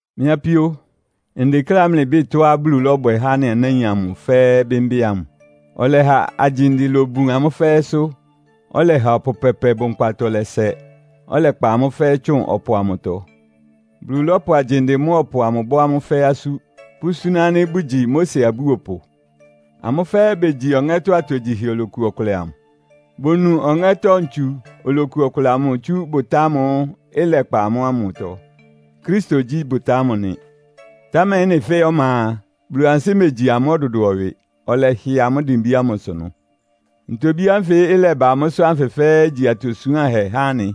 Mɩ́ apíó, ndekléá mlɩbɩ́ɩ tɔ́á Bulu lɔ́bwɛ há anɩ anáin amʋ fɛ́ɛ́ bɩ́mbɩ́ ámʋ. Ɔlɛha agyinde lobun amʋ́ fɛ́ɛ́sʋ́, ɔlɛha ɔpʋ pɛpɛ bʋnkpatɔ lɛ́sɛ, ɔlɛkpa amʋ́ fɛ́ɛ́ tsʋn ɔpʋ amʋtɔ. Bulu lɔ́pʋ agyinde mʋ́a ɔpʋ amʋ bɔ́ amʋ́ fɛ́ɛ́ asú, pʋ́súná ánɩ́ bʋgyi Mose abúopʋ. Amʋ́ fɛ́ɛ́ begyi ɔŋɛ́tɔ́ atogyihɛ oloku ɔkʋlɛ amʋ. Bonu ɔŋɛ́tɔ́ ntsu oloku ɔkʋlɛ amʋ tsú bʋtá ámʋ́ʋ́ ɩlɛkpa amʋ́ ámʋtɔ. Kristo gyí bʋtá ámʋ nɩ. Támɛ ɩ́nɩ fɛ́ɛ́ ɔma a, Bulu ansɩ́ megyi amʋ́ ɔdʋdʋɔ ɩwɩ, ɔlɛhɩ amʋ́ dimbí ámʋsʋ ɩnʋ. Ntobí ánfɩ ɩlɛba amʋ́sʋ́ ánfɩ fɛ́ɛ́ igyi atosuánhɛ há anɩ,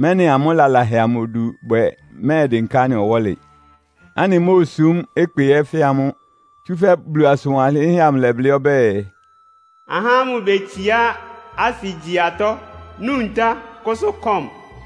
mɛ́nɩ amʋ́ lalahɛ amʋ odu bwɛ mɛ́ɛdɩnká anɩ ɔwɔ́lɩ, ánɩmóosúm ɩkpɩ ɛ́ fɛ́ amʋ́. Tsúfɛ́ Bulu asʋn wanlɩ́nhɛ́ amʋ ɩlɛblɩ́ ɔbɛ́ɛ, “Ahá ámʋ betsiá asɩ gyí atɔ́, nu ntá, kʋ́sʋ́ kɔ́m.”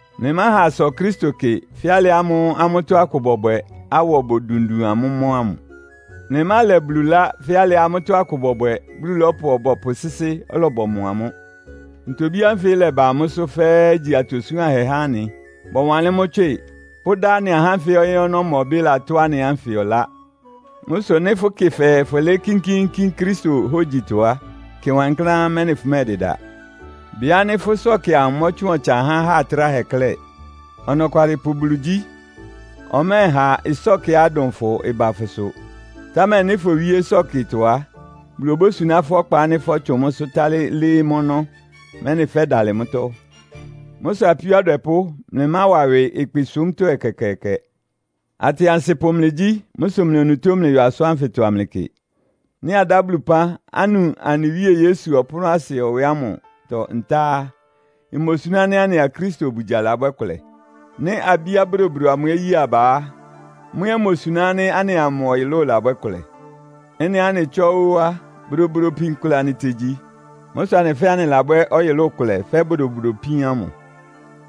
Mlɩmáha asɔ Kristo kɩ fɛ́ alɩ ámʋ́ʋ́ amʋ́tɔ́ akʋ bɔbwɛ, awɔ bodundun amʋ́ mɔ́ ámʋ. Mlɩmálɛ Bulu ɩlá fɛ́ alɩá amʋ́tɔ́ akʋ bɔbwɛ, Bulu lɔ́pʋ ɔbɔpʋ sɩ́sɩ́, ɔlɔbɔmɔ amʋ́. Ntobí ánfɩ ɩ́lɛba amʋ́sʋ́ fɛ́ɛ́ igyi atosuánhɛ há anɩ. Bɔwanlɩ́n mʋ́ tswɩ, pʋ́dá anɩ ahá ánfɩ ɔyɩ́ ɔnɔ́mɔbɩ́ latʋ́ anɩ ánfɩ ɔlá. Mʋ́ sʋ nɩ́ fʋkɩ fɛɛ fʋlɩɩ́ kínkíínkín Kristo hógyitɔ á, kɩ wankláán, mɛ́nɩ fʋmɛ́ɛdɩda. Bɩ ánɩ́ fʋ́ ɩsɔ́kɩ amʋ mɔtsʋn ɔtsan há aha tráhɛ klɛ́. Ɔnɔkwalɩpʋ Bulu gyí. Ɔmɛ́ɛha ɩsɔ́kɩá ɩdʋn fʋ ɩba fʋsʋ. Támɛ nɩ́ fowíé ɩsɔ́kɩtɔ á, Bulu obósuná fʋ́ ɔkpa ánɩ́ fɔ́tsʋn mʋ́sʋ́ tálɩ́ lɩ́ɩ́ mʋ́ ɔnɔ́, mɛ́nɩ fɛ́dalɩ mʋ́tɔ́. Mʋ́ sʋ apíó adwɛpʋ́, mlɩmáwa ɩwɩ ɩkpɩsúmtɔ́ ɛkɛkɛɛkɛ. Atɩansɩpʋ mlɩgyí. Mʋ́ sʋ mlɩ onutó mlɩyɔ asʋ́n ánfɩtɔ amlɩkɩ. Nɩ́ adá Bulu ɩpán, anu anɩ Wíe Yesu ɔpʋ́nʋ́asɩ ɛwɛ ámʋtɔ ntá á, imosuná ánɩ́ anɩa Kristo obugya labwɛ́ kʋlɛ? Nɩ́ abíá bodobodo amʋ ɛ́ ye aba á, mʋ́ ɛ́ imosuná ánɩ́ anɩa mʋ ɔyʋlʋ́ʋ labwɛ́ kʋlɛ? Ɩ́nɩá anɩ tsɔ́ ó á, bodobodo ipin kʋlɛ anɩtegyi. Mʋ́ sʋ anɩ fɛ́ɛ́ anɩlabwɛ́ ɔyʋlʋ́ʋ kʋlɛ fɛ́ bodobodo ipín ámʋ.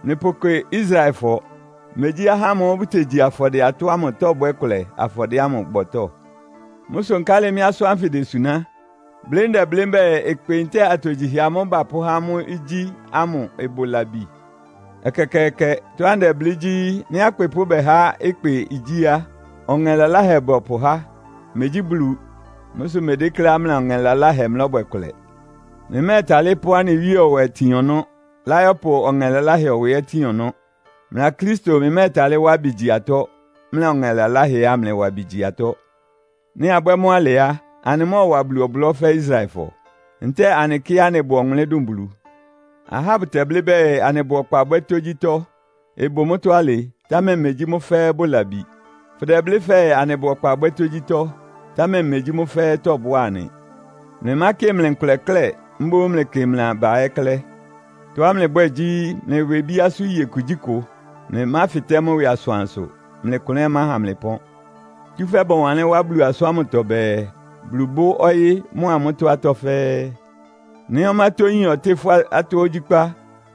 Mlɩpʋkɩ Israelfɔ, megyí ahá ámʋ́ʋ́ bʋtegyi afɔdɩɛ-atɔ́ ámʋ tɔ́bwɛ́ kʋlɛ afɔdɩɛ ámʋ bɔtɔ́? Mʋ́ sʋ nkálɩ mɩ́ asʋ́n ánfɩ desuná? Blɩ́ ndɛblɩ́ mbɛ́ɛ, ɩkpɩ ntɛ́ɛ atogyihɛ amʋ́ʋ́ bapʋ́há amʋ́ igyí amʋ ɩbʋ labi? Ɛkɛkɛɛkɛ! Tɔ́á ndɛblɩ́ gyí, nɩ́ akpɩpʋ́ bɛhá ɩkpɩ igyí a, ɔŋɛ laláhɛ bɔpʋhá, megyí Bulu. Mʋ́ sʋ mmedékléá mlɩa ɔŋɛ laláhɛ mlɔ́bwɛ kʋlɛ. Mlɩmɛ́ɛtalɩ́ pʋ́ anɩ Wíe ɛwɛ tin ɔnɔ́, láyɔ́pʋ ɔŋɛ laláhɛ ɛwɛ ɛ́ tin ɔnɔ́. Mlɩa Kristo mlɩmɛ́ɛtalɩ́ wá ɩbɩ gyi atɔ́, mlɩa ɔŋɛ laláhɛ ɛ́ amlɩwa ɩbɩ gyi atɔ́. Nɩ́ abwɛ́ mʋ́ alɩ á, anɩmɔ́ɔwa Bulu ɔblɔ́ fɛ́ Israelfɔ? Ntɛ́ɛ anɩkɩ́á anɩbʋ ɔwʋnlɩ́n dʋn Bulu? Ahá bʋtɛblɩ́ bɛɛ, “Anɩbʋ ɔkpa bwɛ́ tógyítɔ́.” Ɩbʋ mʋ́tɔ́ alɩ, támɛ megyí mʋ́ fɛ́ɛ́ bʋ labi. Fʋdɛblɩ́ fɛɛ, “Anɩbʋ ɔkpa bwɛ́ tógyítɔ́.” Támɛ megyí mʋ́ fɛ́ɛ́ tɔ́bʋ́a anɩ. Mlɩmákɩ mlɩ nkʋlɛ klɛ́, mboún mlɩkɩ mlɩ aba ɛ́ klɛ́. Tɔ́á mlɩbwɛ́ɛ gyí, mlɩwɩ ibíásʋ́ iye kugyíkʋ. Mlɩmáfɩtɛ́ mʋ́ ɩwɩ asʋansʋ, mlɩ klʋn ɛ́ ɩmáha mlɩ pɔ́n. Tsúfɛ́ bɔwanlɩ́n wá Bulu asʋ́n ámʋtɔ bɛɛ, “Bulu bʋ́ ɔyɩ́ mʋ́a mʋ́tɔ́ atɔ́ fɛ́ɛ́.” Nɩ́ ɔmátɔ́yín ɔtɩ́ fʋ́ atɔ́ ogyíkpá,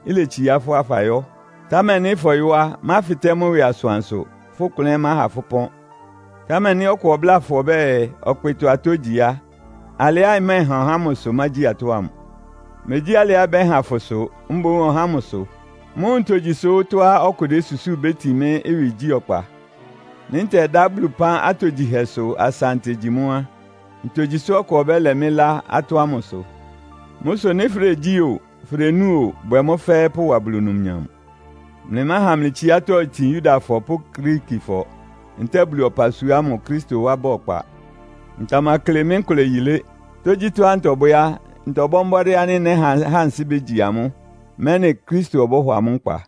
iletsiá fʋ́ á, fayɔ́. Támɛ nɩ́ fɔyɔ́ á, máfɩtɛ́ mʋ́ ɩwɩ asʋansʋ, fʋ́ klʋn ɛ́ ɩmáha fʋ́ ɩpɔ́n. Támɛ nɩ́ ɔkʋ ɔbláa fʋ ɔbɛ́ɛ, “Ɔkpɩtɔ-atɔ́ igyi” á, alɩá ɩmɛ́ɛhan ɔhá ámʋ sʋ mágyi atɔ́ ámʋ. Megyí alɩá ɩbɛ́han fʋ sʋ, mboún ɔhá ámʋ sʋ. Mʋ́ʋ́ ntogyi sʋ́ tɔ́á ɔkʋ désusúu ibétin mɩ́ ɩwɩgyí ɔkpa? Nɩ́ ntɛdá Bulu ɩpán atogyihɛsʋ asa ntegyi mʋ́ á, ntogyi sʋ́ ɔkʋ ɔbɛ́lɛ mɩ́ ɩlá atɔ́ ámʋ sʋ? Mʋ́ sʋ nɩ́ fʋdegyí o, fʋdenúu o, bwɛ mʋ́ fɛ́ɛ́ pʋwa Bulu numnyam. Mlɩmáha mlɩ tsiátɔ́ itin Yudafɔ pʋ́ Griikifɔ ntɛ́ɛ Bulu ɔpasua ámʋ Kristo wá ba ɔkpa. Ntamakle mɩ́ nkʋlɛ yilé. Tógyítɔ́á ntɔbwɛ́ á, ntɔbɔ́ mbɔ́dɩ́ ánɩ́ nɛ́ha ahá ansɩ́ bégyi amʋ́, mɛ́nɩ Kristo ɔbɔ́hɔ amʋ́ nkpa.